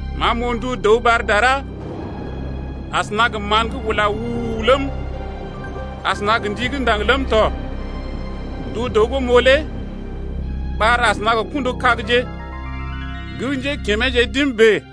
Ma m’oo ndu dəw ɓar dara asəna gə mán gə́ ula u-u-u ləm, asəna gə ndi gə́ ndaŋg ləm tɔ. Ndu dəw gə́ m’oo lé ɓar asəna gə kṵdu-kagje gə́ njékimeeje d’im bèe.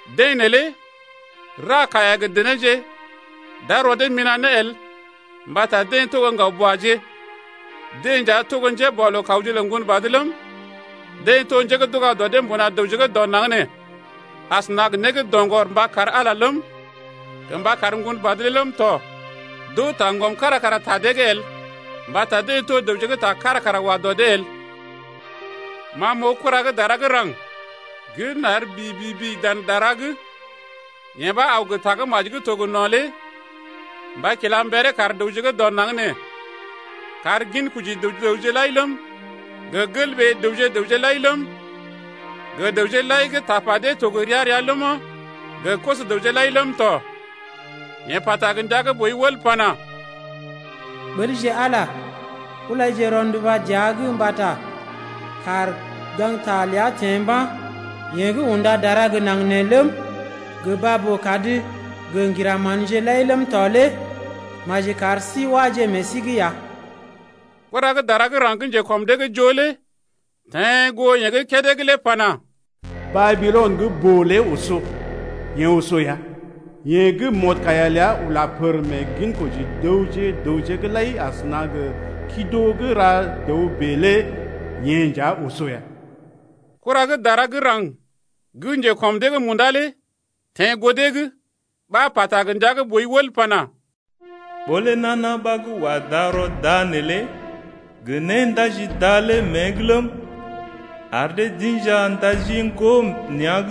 Deḛ neelé ra kaiya gə denéje d’ar rɔ dee mina̰ ne el mbata deḛ to gə́ ŋgaw-buaje. Deḛ nja to gə́ njéboalookawje lə Ŋgonbad ləm, deḛ to njé gə́ d’uga dɔ dee mbuna dəwje gə́ dɔ naŋg nee asəna gə né gə́ doŋgɔr mba kar Ala ləm, gə mba kar Ŋgonbad lé ləm tɔ. D’oo taŋgɔm kára kara ta dee’g el mbata deḛ to dəwje gə́ ta kára kara wa dɔ dee el. Ma m’oo kura gə́ dara gə́ raŋg gə́ nar bibibi dan dara’g. Yeḛ ɓa aw gə Tagə́maji gə́ to gə no̰ lé mba kila mberee kar dəwje gə́ dɔ naŋg nee, kar ginkoji dəwje gə raŋg lai ləm, gə gelɓee dəwje-dəwje lai ləm, gə dəwje lai gə́ tapa dee to gə ria-ria ləma, gə koso-dəwje lai ləm tɔ. Yeḛ pata gə ndia gə́ boi wəl pana: Ɓəlje Ala, ulaje rɔnduba dəa’g mbata kàr gaŋgta ləa teḛ mba̰. Yeḛ gə́ unda dara gə naŋg nee ləm, gə baa-boo-kad gə ŋgira manje lai ləm tɔ lé maji kar sí wáje meḛ sí’g ya. Kura gə́ dara gə́ raŋg gə́ njekɔm dee’g joo lé teḛ goo yeḛ gə́ kédé’g lé pana: Babilɔn gə́ boo lé oso, yee oso ya! Yee gə́ mɔdkaiya ləa ula pər meḛ ginkoji dəwje gə raŋg’g lai asəna gə kido gə́ ra dəw bèe lé yee nja oso ya. Kura gə́ dara gə́ raŋg gə́ njekɔm dee’g munda lé teḛ goo dee’g ɓa pata gə ndia gə́ boi wəl pana: Ɓó lé nana ɓa gə́ wa darɔ da neelé gə néndaji da lé mée’g ləm, ar dee d’inja ndaji ŋgo nea̰’g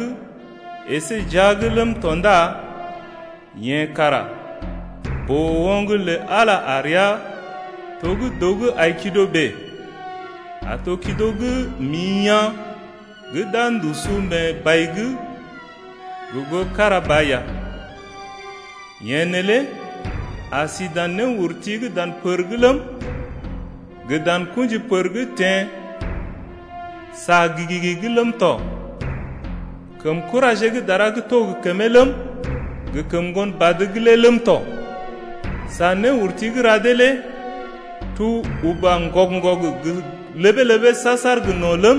əsé jia’g ləm tɔ ndá yeḛ kara boo-oŋg lə Ala a rəa to gə́ dəw gə́ ai kido bèe, a to kido gə́ mḭ yaa̰ gə́ d’a ndusu mee bai’g gə goo kára ba ya. Yeḛ neelé a si dan néurti dan pər’g ləm, gə dan kṵji pər gə́ teḛ sa gi-gi’g ləm tɔ kəm kuraje gə́ dara gə́ to gə kəmee ləm, gə kəm Ŋgonbad’g lé ləm tɔ. Sa néurti gə́ ra dee lé tuu uba ŋgɔg-ŋgɔg gə ləbee-ləbee saar-saar gə no̰ ləm,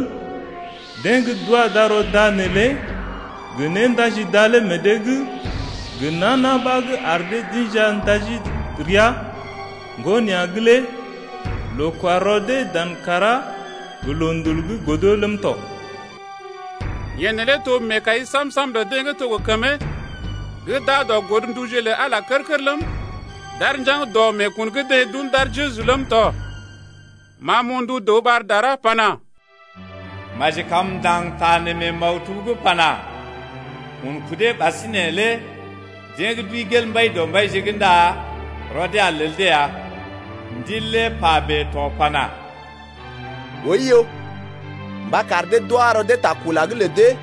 deḛ gə́ d’wa darɔ da neelé gə néndaji da lé meḛ dee’g gə nana ɓa gə́ ar dee d’inja ndaji ria ŋgo nea̰’g lé loo-kwa-rɔ dee dan kàrá gə loondul’g godo ləm tɔ. Yee neelé to meekai sam-sam lə dee gə́ to gə kəmee gə́ d’aa dɔ godnduje lə Ala kər-kər ləm, d’aar njaŋg dɔ meekun gə́ deḛ d’un d’ar Jeju ləm tɔ. Ma m’oo ndu dəw ɓar dara pana: Maji kam m’ndaŋg ta nee mee maktub’g pana: Un kudee ɓasinè lé deḛ gə́ d’wəi gel Mbaidɔmbaije’g ndá rɔ dee a lel dee ya. Ndil lé pa bèe to pana: Oiyo, mba kar dee d’wa rɔ dee ta kula’g lə dee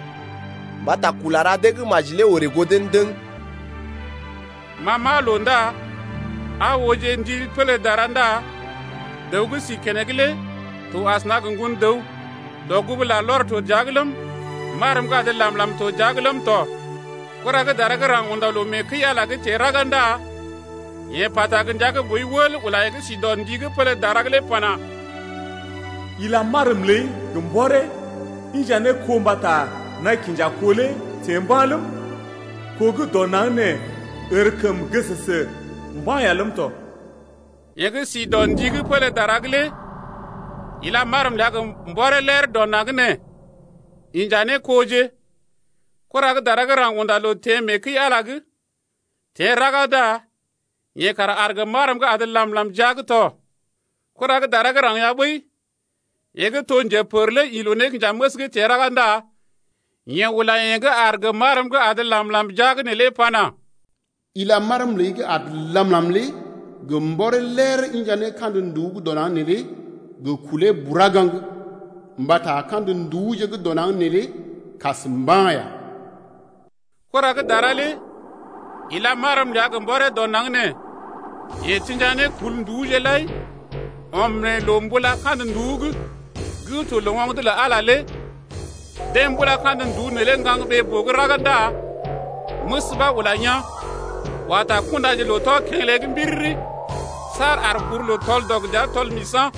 mbata kula ra dee gə́ maji lé orè goo dee ndəŋ. Ma m’aa loo ndá aa ooje ndi pélé dara ndá dəw gə́ si keneŋ lé to asəna gə Ŋgon-dəw, dɔgugu larlɔr to dəa’g ləm, marm gə́ adə làm-làm to jia’g tɔ. Kura gə́ dara gə́ raŋg unda loo mee kəi-Ala’g teḛ raga ndá yeḛ pata gə ndia gə́ boi wəl ula yeḛ gə́ si dɔ ndi gə́ pélé dara’g lé pana: Ila marm ləi gə mbɔree inja ne kó mbata naḭ kinja kó lé teḛ mba̰ ləm, kó gə́ dɔ naŋg nee ərkəm gəsəsə mba̰ ya ləm tɔ. Yeḛ gə́ si dɔ ndi gə́ pélé dara’g lé ila marm ləa gə mbɔree ler dɔ naŋg nee inja ne koje. Kura gə́ dara gə́ raŋg unda loo mee kəi-Ala’g teḛ raga ndá yeḛ kara aar gə marm gə́ adə làm-làm jia’g tɔ. Kura gə́ dara gə́ raŋg ya ɓəi, yeḛ gə́ to njepər lé ḭ loo-nékinjaməs’g teḛ raga ndá yeḛ ula yeḛ gə́ aar gə marm gə́ adə làm-làm jia’g neelé pana: Ila marm ləi gə́ adə làm-làm lé gə mbɔree ler inja ne kandə nduú gə́ dɔ naŋg neelé gə kulee bura gaŋg, mbata kandə nduúje gə́ dɔ naŋg neelé kas mba̰ ya. Kura gə́ dara lé ila marm ləa gə mbɔree dɔ naŋg nee. Yeḛ tḭja ne kul nduúje lai ɔm mee loo-mbula-Kandə-nduú’g gə́ to loo-oŋg lə Ala. Deḛ mbula kandə nduú neelé gaŋg ɓee-boo’g raga ndá məs ɓa ula yaa̰, wa ta kundaje loo-tɔ-kḛgəlé’g mbiriri saar ar kuruloo tɔl-dɔg gə dəa tɔl-misa̰.